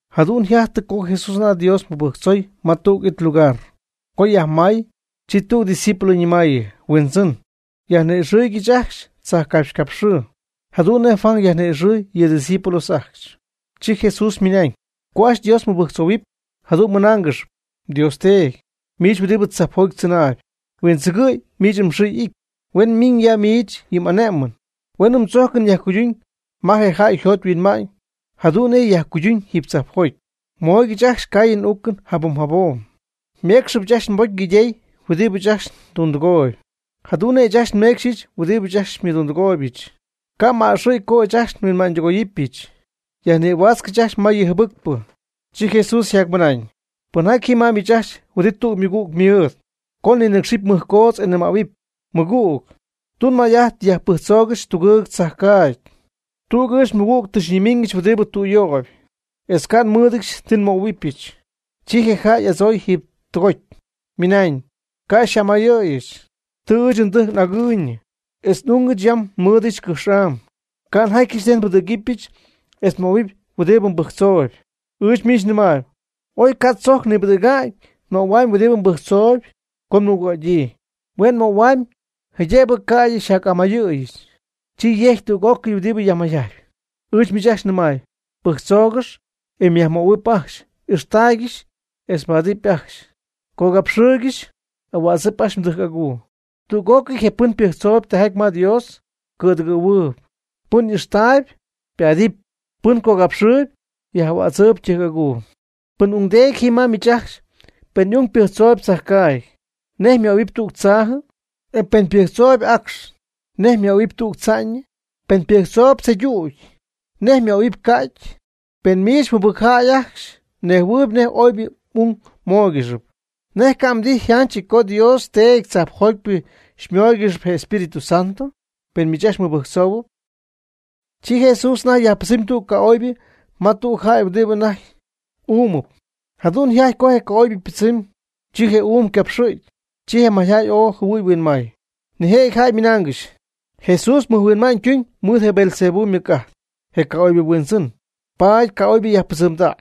Jadu'n yjajtɨ co Jesús anajty Dios mɨbɨjctzoy ma tüg it lugar, co yajmay, chi tüg discípulo ñɨmaayɨ: ―Huindzɨn, yajni'ixɨɨygɨch ajcxy tzajcapxycapxɨɨ, jadu'n nej Juan yajni'ixɨɨy yɨ' ydiscípulos ajcxy. Chi Jesús ymɨnañ: ―Co ajcxy Dios mmɨbɨjctzohuɨpy, jadu'n mɨnáangɨxɨpy: Dios Teedy, miich huɨdi tzajpjoty tzɨnaayb, huindzɨgɨ̈y miich mxɨɨ y'ity. Huen miñ ya miich yɨ m'ané'mɨn. Huen mdzójcɨn yajcuyduñ ma je jäy yjot yhuinma'ñ jadu'n nej yajcuyduñ jiiby tzajpjoty. Mooygɨch ajcxy ngaayɨn n'uucɨn jabom jabom. Méecxɨbɨch ajcxy nbocy ngaydey huɨdibɨ ɨɨch ajcxy ndundɨgooyb, jadu'n nej ɨɨch ajcxy nmeecxyɨch huɨdibɨ ajcxy xymɨdundɨgooybɨch. Ca' m'a'ɨxɨ̈y co ɨɨch ajcxy huinma'ñ tɨgoyɨpɨch. Yajnïhuaatzcɨch ajcxy ma yɨ jɨbɨcpɨ. Chi Jesús yjacmɨnañ: ―Pɨnjaty ji ma miich ajcxy huɨdi tüg ymɨgüg mɨɨd, co ninɨ́cxɨpy mɨjcoodz e mnɨmähuɨpy: “Mɨgüg, tun may'ajt yajpɨjctzoogɨch tugɨɨg mdzajcaagy. Tüg ɨɨch nmɨgüg tɨ xyñimiñɨch huɨdi tüyöyp, etz ca' nmɨ́ɨdɨdyɨch ti nmöhuɨbɨch.” Chi je jäy y'adzooy jiiby tɨgoty, ymɨnañ: “Ca' xy'amayɨ̈yɨch. Tɨ ɨɨch ndɨjc n'agɨɨyñɨ, etz n'ungɨch yam nmɨɨdɨch cɨjx'am; ca' njatyɨch nej nbɨdɨ̈gɨbɨch etz nmöhuɨpy huɨdi mbɨjctzooyb.” Ɨɨch miich nɨmaayb, oy ca' tzojc nipɨdɨ̈ga'ñ ymöhuamy huɨdi pɨjctzou co mɨgüg'adyii, hue' ymöhuamy jaydëbɨ ca'ydɨ yjac'amayɨ̈yii, chi yegɨpy tüg'ócɨy huɨdi yajmayjajtpy. Ɨɨch miich ajcxy nɨmaayb: Pɨjctzóogɨx, e myajmöhuɨpy ajcxy. Ixtaaygɨx, e mbaadɨpy ajcxy; cogapxɨɨygɨx, ahuädzɨp ajcxy mdɨjc'aguu. Tüg'ócɨy je' pɨn pɨjctzoob tijaty ma Dios, cɨ̈dɨgɨ̈huɨɨb; pɨn y'ixtaayb, ypaadɨpy; pɨn cogapxɨɨyb, yaj'ahuatzɨɨb ytɨjc'aguu. ¿Pɨn ungdeedy ji ma miich ajcxy pen y'ung ypɨjctzoob tzajcaagy, nej mmöhuɨpy tüg tzaajɨ? ¿E pɨn ypɨjctzooyb acx, nej jëbɨ mmöhuɨpy tüg tza'ñɨ? ¿Pen ypɨjctzoyb tzeydüty, nej jëbɨ mmöhuɨpy ca'ty? Pen miich jɨbɨcjäy ajcxy mnejhuɨɨyb nej oybɨ m'ung móoygɨxɨpy, ¿nej ca' mdijy yjánchɨty co mDios Teedy tzajpjotypɨ xymóoygɨxɨpy je Espíritu Santo, pen miich ajcxy mmɨbɨjctzohuɨpy? Chi Jesús anajty yajpɨdzɨmy tüg ca'oybɨ ma tüg jäy huɨdi anajty uumɨp. Jadu'n yjajty co je ca'oybɨ ypɨdzɨmy, chi je uum ycapxɨ̈gy. Chi je mayjäy ooy jɨhuɨy huinmay. Nijëjɨty jäy ymɨnaangɨxy: ―Jesús mɨjhuinma'ñ ytumyb mɨɨd je Beelzebú ymɨc'ajt, je ca'oybɨ yhuindzɨn, paady ca'oybɨ yajpɨdzɨmdäy.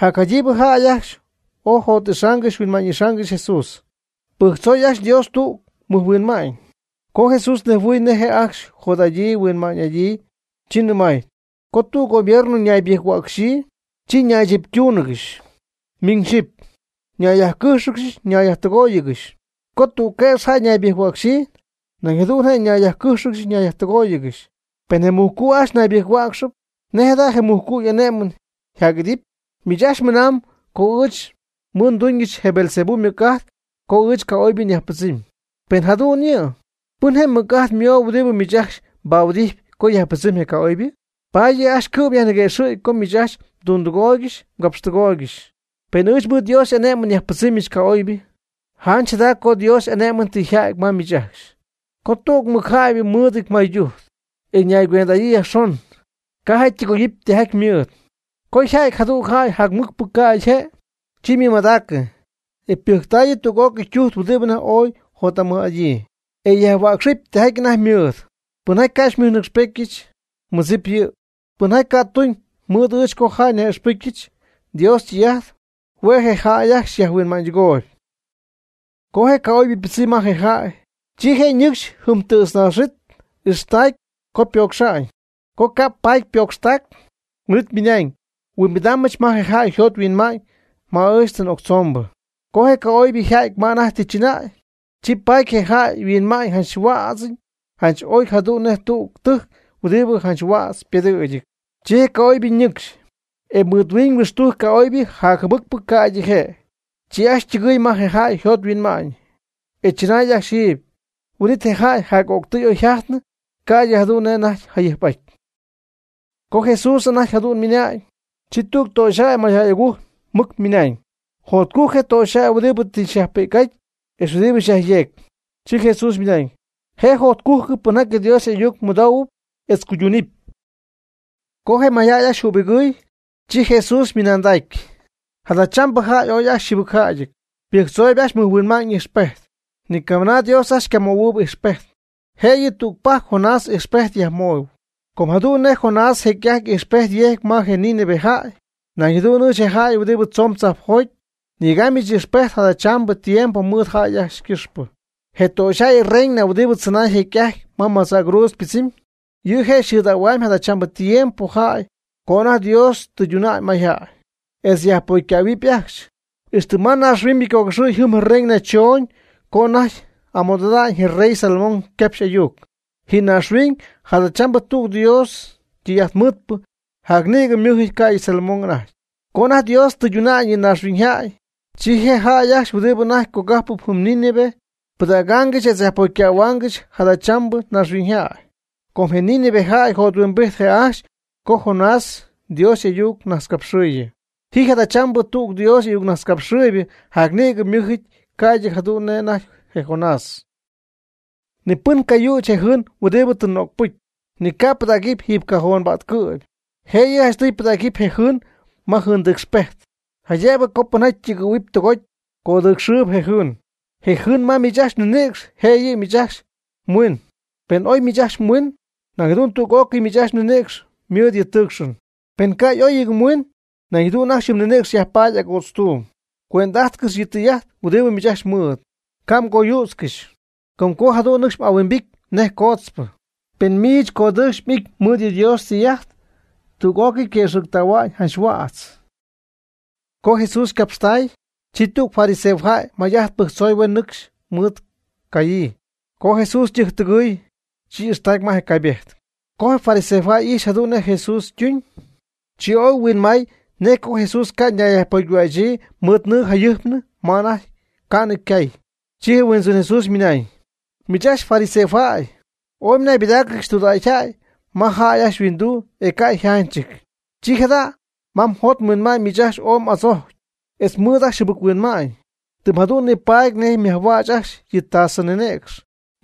Jacjaydiibɨ jäy ajcxy co jot'ixaangɨxy huinma'ñ'ixaangɨxy Jesús, pɨjctzooy ajcxy Dios tüg ymɨjhuinma'ñ. Co Jesús nejhuɨɨy nej je' ajcxy jot'adyii huinma'ñ'adyii, chi nɨmay: ―Co tüg gobierno ñaybɨjc-huäcxyii, chi ñaychiptúnɨgɨxy miñ xyɨpy; ñayyajcɨ́jxɨgɨxy ñayyajtɨgóoyɨgɨxy; co tüg quëx jäy ñaybɨjc-huäcxyii, nañ jadu'n je' ñayyajcɨ́jxɨgɨxy ñayyajtɨgóoyɨgɨxy. Pen je mujcu' ajcxy ñaybɨjc-huäcxɨp, ¿nej jada je mujcu' y'ané'mɨn yjac'idɨpy? Miich ajcxy mɨnamb co ɨɨch mɨɨd ndúñɨch je Beelzebú ymɨc'ajt co ɨɨch ca'oybɨ nyajpɨdzɨmy. Pen jadu'n yɨ', ¿pɨn je mɨc'ajt mooyb huɨdi miich ajcxy xypahuɨdijtp co yajpɨdzɨmy je ca'oybɨ? Paady yɨ' ajcxy cɨ'm yajniquëxɨ̈cp co miich ajcxy mdundɨgooygɨxy mgapxtɨgooygɨxy. Pen ɨɨch mɨɨd Dios y'ané'mɨn nyajpɨdzɨmyɨch ca'oybɨ, janch jada co Dios y'ané'mɨn tɨ yjäty ma miich ajcxy. Co tüg mɨcjäybɨ mɨɨdɨty maydujt, e ñaycuend'adyii yajxon, ca' je' ytɨgoyɨpy tijaty ymɨɨd. Co yjäty jadüg jäy jacmɨcpɨ ca'ydɨ je', chi ymɨmadägyii, e ypɨjctäyii tüg'ócɨy ytujt huɨdi anajty ooy jot'amɨj'adyii, e yajhuäcxɨpy tijaty anajty ymɨɨd. Pɨnjaty ca' xymɨjnɨcxpétyɨch, nmɨdzipɨch yɨ'. Pɨnjaty ca' ytuñ mɨɨd ɨɨch co jäy nyaj'ixpɨcyɨch Dios ytɨy'ajt, hue' je' ajcxy jäy yajhuinma'ñydɨgooyb. Co je ca'oybɨ ypɨdzɨmy ma je jäy, chi je' ñɨcxy jɨm tɨ̈tznaax ijxtägy co ypocxa'ñ. Co ca' paty ypocxtac, huin'it ymɨna'ñ: “Huimbidaambɨch ma je jäy yjot yhuinma'ñ ma ɨɨch tɨ n'octzombɨ.” Co je ca'oybɨ yja'ty ma anajty tɨ chɨnäy, chi paady je jäy yhuinma'ñ janch yhuädzɨty janch ooy jadu'n nej tüg tɨjc huɨdi janch huädz pedɨ̈gɨty. Chi je ca'oybɨ ñɨcxy, e mɨɨd miñ jahuixtujc ca'oybɨ jacjɨbɨcpɨ ca'ydɨ je'; chi ajcxy ytɨgɨɨy ma je jäy yjot yhuinma'ñ, e chɨnay ajcxy jiiby; huin'it je jäy jac'o'ctɨy oy yjajtnɨ ca'ydɨ jadu'n nej anajty jayɨjp'aty. Co Jesús jadu'n anajty ymɨna'ñ, chi tüg töxyjäy mayjäy agujc mɨc ymɨnañ: ―Jotcujc je töxyjäy huɨdi tɨ xyajpi'c'aty etz huɨdi xyajyeegy. Chi Jesús ymɨnañ: ―Je' jacjotcujc pɨnjaty Dios y'ayuc mɨdoohuɨp etz cuyduunɨp. Co je mayjäy ajcxy jübigɨɨy, chi Jesús ymɨnandacy: ―Jadachambɨ jäy ooy ajcxy yjɨbɨcjäyɨty, ypɨjctzooyb ajcxy mɨjhuinma'ñ ijxpejt. Ni camɨna Dios ajcxy ycamöhuɨɨyb ijxpejt, jëyɨ tügpajc Jonás y'ijxpejt yajmöhuɨp. Com jadu'n nej je Jonás jecy'ajty ijxpejt yejcy ma je Nínive jäy, nañ jadu'n ɨɨch, je jäy huɨdi tzoon tzajpjoty, nyegaamyɨch ijxpejt jadachambɨ tiempo mɨɨd jäy ycɨxpɨ. Je töxyjäy reina huɨdi tzɨnay jecy'ajty ma madzäcruudz ypɨdzɨmy, yɨ' je' xɨ̈dähuam jadachambɨ tiempo jäy co anajty Dios tɨyduna'ñ mayjäy, etz yajpocycähuɨpy ajcxy. Ixtɨ ma naaxhuiñybɨ ycogɨxɨ̈y jɨm je reina chooñ co anajty amɨdo'idanɨ je rey Salomón ycapxy y'ayuc. Ji naaxhuiñ jadachambɨ tüg Dios ytɨy'ajtmɨɨdpɨ jacnïgɨ ymɨ́jɨty ca'ydɨ Salomón anajty. Co anajty Dios tɨyduna'ñ yɨ may naaxhuiñyjäy, chi je jäy ajcxy huɨdibɨ anajty cogajpɨp jɨm Nínive pɨdɨ̈gaangɨxy etz yajpocycähuaangɨxy jadachambɨ naaxhuiñyjäy. Com je Nínive jäy jothuimbijt je' ajcxy co Jonás Dios y'ayucnajtzcapxɨɨyɨ. Ji jadachambɨ tüg Dios y'ayucnajtzcapxɨɨybɨ jacnïgɨ ymɨ́jɨty ca'ydɨ jadu'n nej anajty je Jonás. Ni pɨn ca' yüch je jɨɨn huɨdi tɨ nögpɨty, ni ca' pɨdägy jiiby cajón pa'tcɨ'py, jëyɨ janchtɨy pɨdägy je jɨɨn ma jɨɨndɨcxpejt, jaydëbɨ co pɨnjaty ytɨgɨ̈huɨpy tɨgoty, codɨcxɨɨb je jɨɨn. Je jɨɨn ma miich ajcxy mninïcx je' yɨ' miich ajcxy mhuiin. Pen oy miich ajcxy mhuiin, nañ jadu'n tüg'ócɨy miich ajcxy mninïcx ymɨɨd yɨ' tɨɨcxɨn. Pen ca' y'óyɨty mhuiin, nañ jadu'n ajcxy yɨ mninïcx yajpaty agootztuum. Cuend'ájtcɨx yɨ tɨy'ajt huɨdi miich ajcxy mɨɨd, ca' mgoyützcɨxy, com co jadu'n nɨcxy y'ahuimbity nej cootzpɨ. Pen miich mdɨy'ajt codɨɨcxy y'ity mɨɨd Dios ytɨy'ajt, tüg'ócɨy quëxɨ̈gtähua'ñ janch huädz. Co Jesús ycapxtay, chi tüg fariseojäy may'ajt pɨjctzoy huen nɨcxy mɨɨd cayii. Co Jesús ytɨjctɨgɨɨy, chi y'ixtacy ma je caybejt. Co je fariseojäy ijxy jadu'n nej Jesús ytuñ, chi ooy huinmay nej co Jesús ca' ñayyajpocyhuächyii mɨɨd nɨɨ jayɨjpnɨ ma anajty ca'nɨ ycaayñɨ. Chi je Huindzɨn Jesús ymɨnañ: ―Miich ajcxy fariseojäy, ooy mnaybɨdaaccɨxy tudägyjäy ma jäy ajcxy yhuinduu e ca' yjánchɨty; chi jada' ma mjot mhuinma'ñ miich ajcxy ooy m'adzocy, etz mɨɨd ajcxy jɨbɨc-huinma'ñ; tɨm jadu'n nipaady nej myajhuäch ajcxy yɨ tasɨ ninïcx,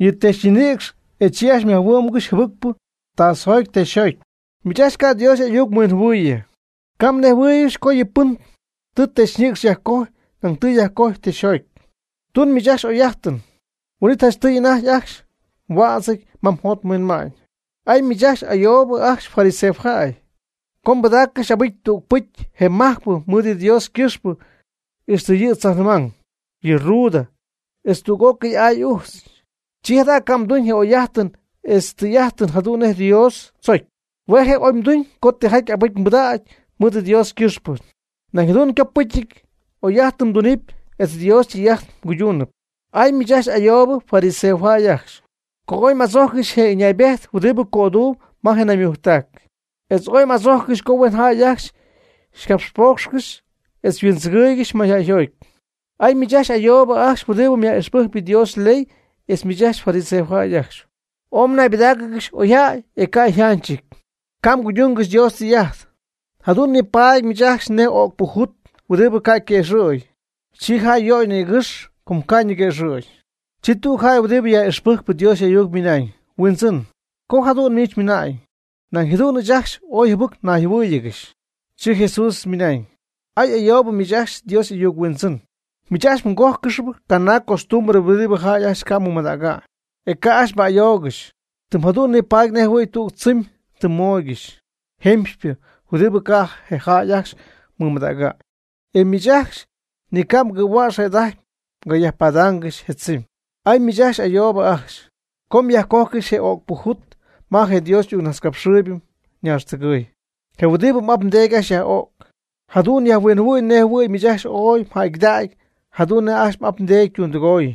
yɨ texyñinïcx e chi ajcxy yajhuɨ́'mgɨxy jɨbɨcpɨ je tasɨjoty je texyjoty. ¡Miich ajcxy ca' Dios y'ayuc huinjɨhuɨɨybɨ! ¿Ca' mnejhuɨɨygɨxy co yɨ pɨn tɨ texyñinïcx yajcojy nañ tɨ yajcojy texyjot? Tun miich ajcxy oyjäy'ájtɨn, huin'it janchtɨy anajty ajcxy mhuädzɨty ma mjot mhuinma'ñ. ¡Ay miich ayoobɨ ajcxy fariseojäy! Com mbɨdaaccɨxy abɨcy tüg pɨcy je majcpɨ mɨɨd yɨ Dios ycɨxpɨ ixtɨ yɨ tzajnɨmang, yɨ ruda, etz tüg'ócɨy aay ujtz. Chi jada' ca' mduñ je oyjäy'ájtɨn etz tɨy'ájtɨn jadu'n nej Dios tzocy. Hue' je' oy mduñ co tijaty abɨcy mbɨdägy mɨɨd Dios ycɨxpɨ, nañ jadu'n copɨcy oyjäy'ájtɨn mdunɨpy etz Dios ytɨy'ajt mguydunɨpy. ¡Ay miich ayoobɨ fariseojäy ajcxy! Co ooy m'adzójccɨxy je ɨñaybejt huɨdi cöduum ma naymujctac, etz ooy m'adzójccɨxy co huen jäy ajcxy xycapxpoocxcɨxy oy huindzɨgɨ̈y mayjäy agujc. ¡Ay miich ayoobɨ ajcxy huɨdi yaj'ijxpɨjcp Dios yley etz miich fariseojäy ajcxy! Oy mjanaybɨdáacɨgɨxy oyjäy e ca' yjánchɨty, ca' mguydungɨxy Dios ytɨy'ajt, jadu'n nipaady miich ajcxy nej öcpɨ jut huɨdi ca' yquëxɨ̈gy, chi jäy yöy nïgɨx, com co ca' ñiguëxɨ̈gy. Chi tüg jäy huɨdibɨ yaj'ixpɨjcp Dios y'ayuc ymɨnañ: ―Huindzɨn, co jadu'n miich mɨna'ñ, nañ jadu'n ɨɨch ajcxy ooy jɨbɨc nayjɨhuɨ́ɨyɨgɨxy. Chi Jesús ymɨnañ: ―¡Ay ayoob miich ajcxy Dios y'ayuc huindzɨn! Miich ajcxy mgójcɨxyp canaag costumbre huɨdi je jäy ajcxy ca' mɨmadäga'ñ, e ca' ajcxy mba'ayoogɨxy, tɨm jadu'n nipaady nej jɨhuɨ̈y tüg tzɨmy tɨ mmooygɨxy jemxypɨ huɨdi ca' je jäy ajcxy mɨmadäga'ñ, e miich ajcxy ni ca' mgɨ̈huäx jëda'ajty mgayajpadaangɨxy je tzɨmy. ¡Ay miich ayoob ajcxy! com myajcojcɨxy je ögpɨ jut ma je Dios ayucnajtzcapxɨɨybɨ naaxtɨgɨy, je huɨdi m'ap mdeedy ajcxy yaj'o'c. Jadu'n yajhuinjɨhuɨ̈y nej jɨhuɨ̈y miich ajcxy ooy mjäygɨdägy jadu'n nej ajcxy m'ap mdeedy ytundɨgoy.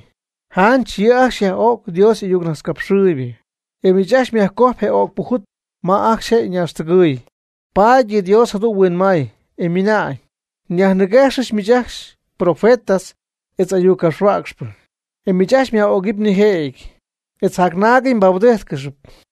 Janch yɨ' ajcxy yaj'ögy Dios y'ayucnajtzcapxɨɨybɨ, e miich ajcxy myajcoj je öcpɨ jut ma ajcxy je' ñaaxtɨgɨɨy. Paady yɨ Dios jadu'n huinmay, e mɨnañ: Nyajniguexɨpyɨch miich ajcxy profetas etz y'ayuccapxhuäcxpɨ, e miich ajcxy myaj'ögɨp nijëjɨty, etz jacnaagɨty mbahuɨdijttáccɨxɨpy.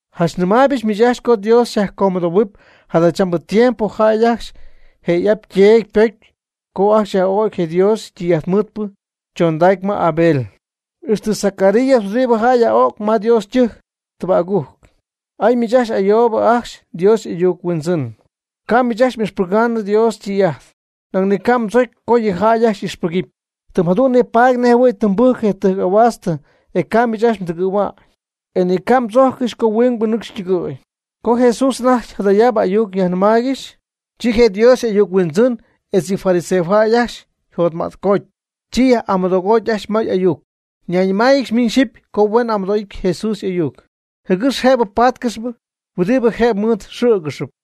Janch nɨmaaybɨch miich ajcxy co Dios yajcomɨdohuɨpy jadachambɨ tiempo jäy ajcxy je y'ap yteedy ypocy co ajcxy yaj'o'cy Dios ytɨy'ajtmɨɨdpɨ chondägy ma Abel, ixtɨ Zacarías huɨdi jäy yaj'o'c ma Dios ytɨjc tɨba'gujc. ¡Ay miich ayoob ajcxy Dios y'ayuc huindzɨn! Ca' miich ajcxy m'ixpɨga'ñ Dios ytɨy'ajt, nañ ca' mdzocy co yɨ jäy ajcxy ixpɨgɨpy; tɨm jadu'n nipaady nejjɨhuɨ̈y tɨ mbɨcy je tɨjc ahuaast e ca' miich ajcxy mdɨgɨ̈hua'ñ, e ni mgatzojccɨxy co huingbɨ nɨcxy ytɨgɨ̈y. Co Jesús anajty jadayaab ayuc yajnɨmaaygɨxy, chi je Dios y'ayuc huindzɨn etz yɨ fariseojäy ajcxy jotmätcooty chi yaj'amɨdogoty ajcxy may ayuc. Ñayñɨmáayɨgɨxy miñ xyɨpy co huen amɨdo'ijt Jesús y'ayuc, jɨgɨx jëb páatcɨxɨpy huɨdi jëb mɨɨd xɨ̈gɨxɨpy.